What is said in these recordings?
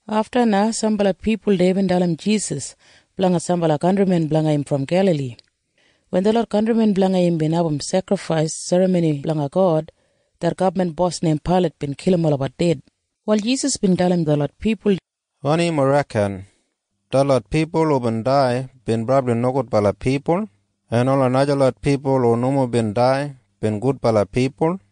Afta na sambala pipul deya bin dalim Jisas blanga sambala kantrimen blanga im brom Gelali. Wen detlot kantrimen blanga im bin abum sekrifais serramoni blanga God, det gabman bos neim Pailat bin kilim olabat ded. Wal Jisas bin dalim detlot pipul, “Wanim yumob reken? Detlot pipul hubin dai bin brabli nogudbala pipul en ola najalot pipul hu nomo bin dai bin gudbala pipul?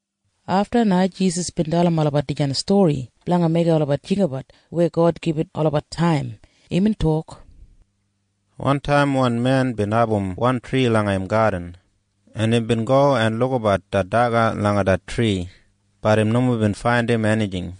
Afta na Jisas bin dalim olabat dijan stori blanga meigim olabat jinggabat weya God gibit olabat taim. Imbin tok, “Wantaim wan men bin abum wan tri langa im gadin, en imbin go en lukabat det daga langa det tri. Bat im nomo bin faindim enijing.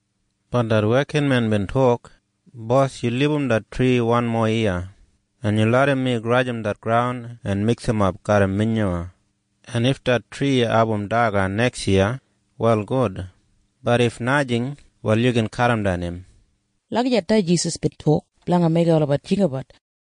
Bat det wekinmen bin tok, ‘Bos, yu libum det tri wanmo yiya, en yu larram mi grajim det graun en miksimap garram minyuwa. En if det tri abum daga neksyiya, wal gud. Bat if najing, wal yu gin kadimdan im.’” Lagijat na Jisas bin tok blanga meigim olabat jinggabat.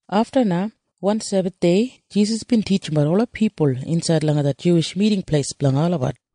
Afta na wan Sebathdei Jisas bin titjimbat ola pipul insaid langa det Juwish Miting Pleis blanga olabat,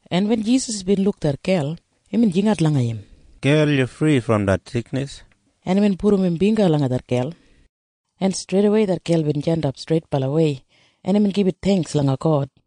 En wen Jisas bin luk det gel, imbin jingat langa im, “Gel, yu fri brom det siknis.” En imbin pudum im bingga langa det gel, en streidawei det gel bin jandap streitbalawei, en imbin gibit theingks langa God.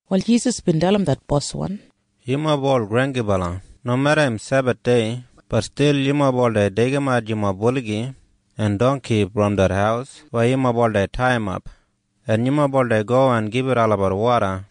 Wal Jisas bin dalim det boswan, “Yumob ol granggibala! Nomeda im Sebathdei, bat stil yumob oldei deigimat yumob buligi en dongki brom det haus weya yumob oldei taiyimap, en yumob oldei go en gibit olabat woda.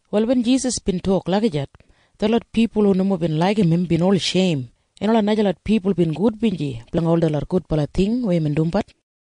Wal wen Jisas bin tok lagijat, detlot pipul hu nomo bin laigim im bin ol sheim, en ola najalot pipul bin gudbinji blanga ol detlot gudbala ting weya imbin dumbat.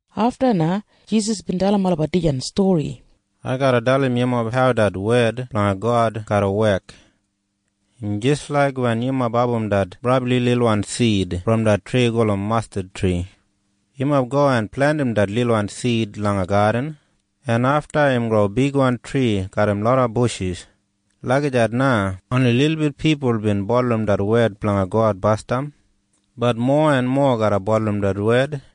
Afta na Jisas bin dalim olabat dijan stori, “Ai garra dalim yumob hau det wed blanga God garra wek. Im jis laik wen yumob abum det brabli lilwan sid brom det tri gulum mastadtri. Yumob go en plentim det lilwan sid langa gadin, en afta im gro bigwan tri garram loda bushis. Lagijat na oni lilbit pipul bin bulurrum det wed blanga God basdam. Bat mowa en mowa garra bulurrum det wed.”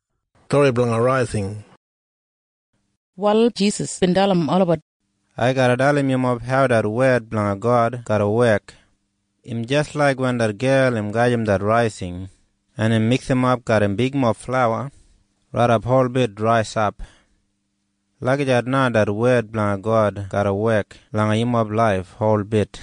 Wal wanmo Jisas bin dalim olabat, “Ai garra dalim yumob hau det wed blanga God garra wek. Im jis laik wen det gel im gajim det raising en im miksimap garram bigmob flauwa raidap holbit raisap. Lagijat na det wed blanga God garra wek langa yumob laif holbit.”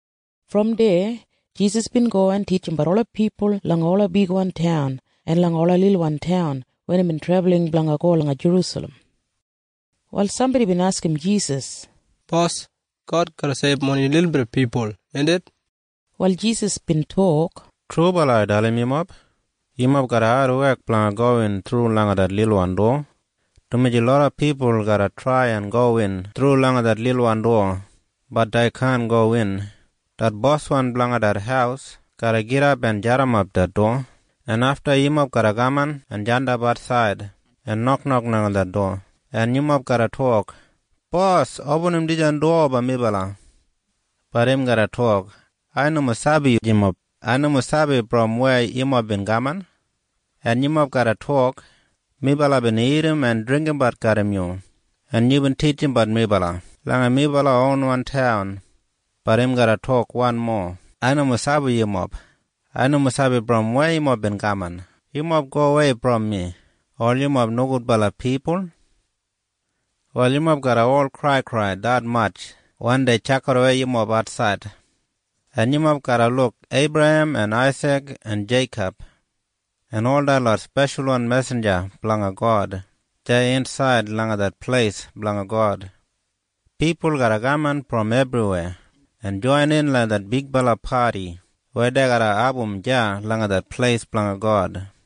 Brom deya Jisas bin go en titjimbat ola pipul langa ola bigwan taun en langa ola lilwan taun wen imbin trebulin blanga go langa Jerusalem. Wal sambodi bin askim Jisas, “Bos, God garra seibum oni lilbit pipul, indit?” Wal Jisas bin tok, “Trubala ai dalim yumob. Yumob garra adwek blanga gowin thru langa det lilwan dowa, dumaji loda pipul garra trai en gowin thru langa det lilwan dowa. Bat dei kaan gowin. Det boswan blanga det haus garra gidap en jadimap det dowa, en afta yumob garra kaman en jandap atsaid en noknok langa det dowa, en yumob garra tok, ‘Bos, opinim dijan dowa blanga melabat!’ Bat im garra tok, ‘Ai nomo sabi yumob. Ai nomo sabi brom weya yumob bin kaman.’ En yumob garra tok, ‘Melabat bin dagat en dringgimbat garram yu. En yubin titjimbat melabat langa melabat ronwan taun!’ Bat im garra tok wanmo, ‘Ai nomo sabi yumob. Ai nomo sabi brom weya yumob bin kaman. Yumob gowei brom mi, ol yumob nogudbala pipul!’ “Wal yumob garra ol kraikrai detmatj wen dei tjakidawei yumob atsaid, en yumob garra luk Eibrahem en Aisik en Jeikob en ol detlot speshalwan mesinja blanga God deya insaid langa det pleis blanga God. Pipul garra kaman brom ebriweya en joinin langa det bigbala padi weya dei garra abum deya langa det pleis blanga God.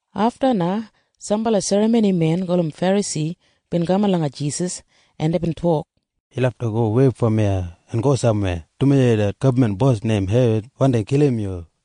Afta na sambala serramonimen gulum Ferasi bin kaman langa Jisas, en deibin tok, “Yu lafta gowei brom iya en go samweya, dumaji det gabman bos neim Herod wandi kilim yu.”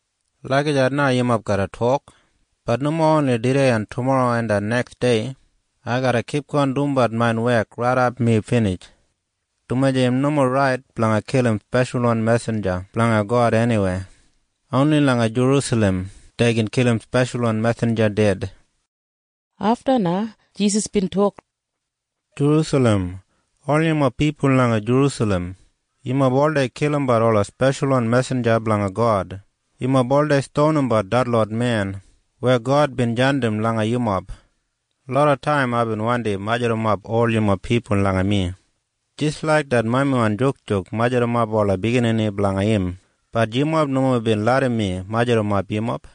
Lagijat na yumob garra tok. Bat nomo oni tudei en tumorro en det neksdei. Ai garra kipgon dumbat main wek raidap mi binij, dumaji im nomo rait blanga kilim speshalwan mesinja blanga God eniweya. Oni langa Jerusalem dei gin kilim speshalwan mesinja ded.” Afta na Jisas bin tok, “Jerusalem! Ol yumob pipul langa Jerusalem! Yumob oldei kilimbat ola speshalwan mesinja blanga God! Yumob oldei stonimbat detlot men weya God bin jandim langa yumob! Loda taim aibin wandi majurrumap ol yumob pipul langa mi jis laik det mamiwan jukjuk majurrumap ola biginini blanga im. Bat yumob nomo bin larram mi majurrumap yumob!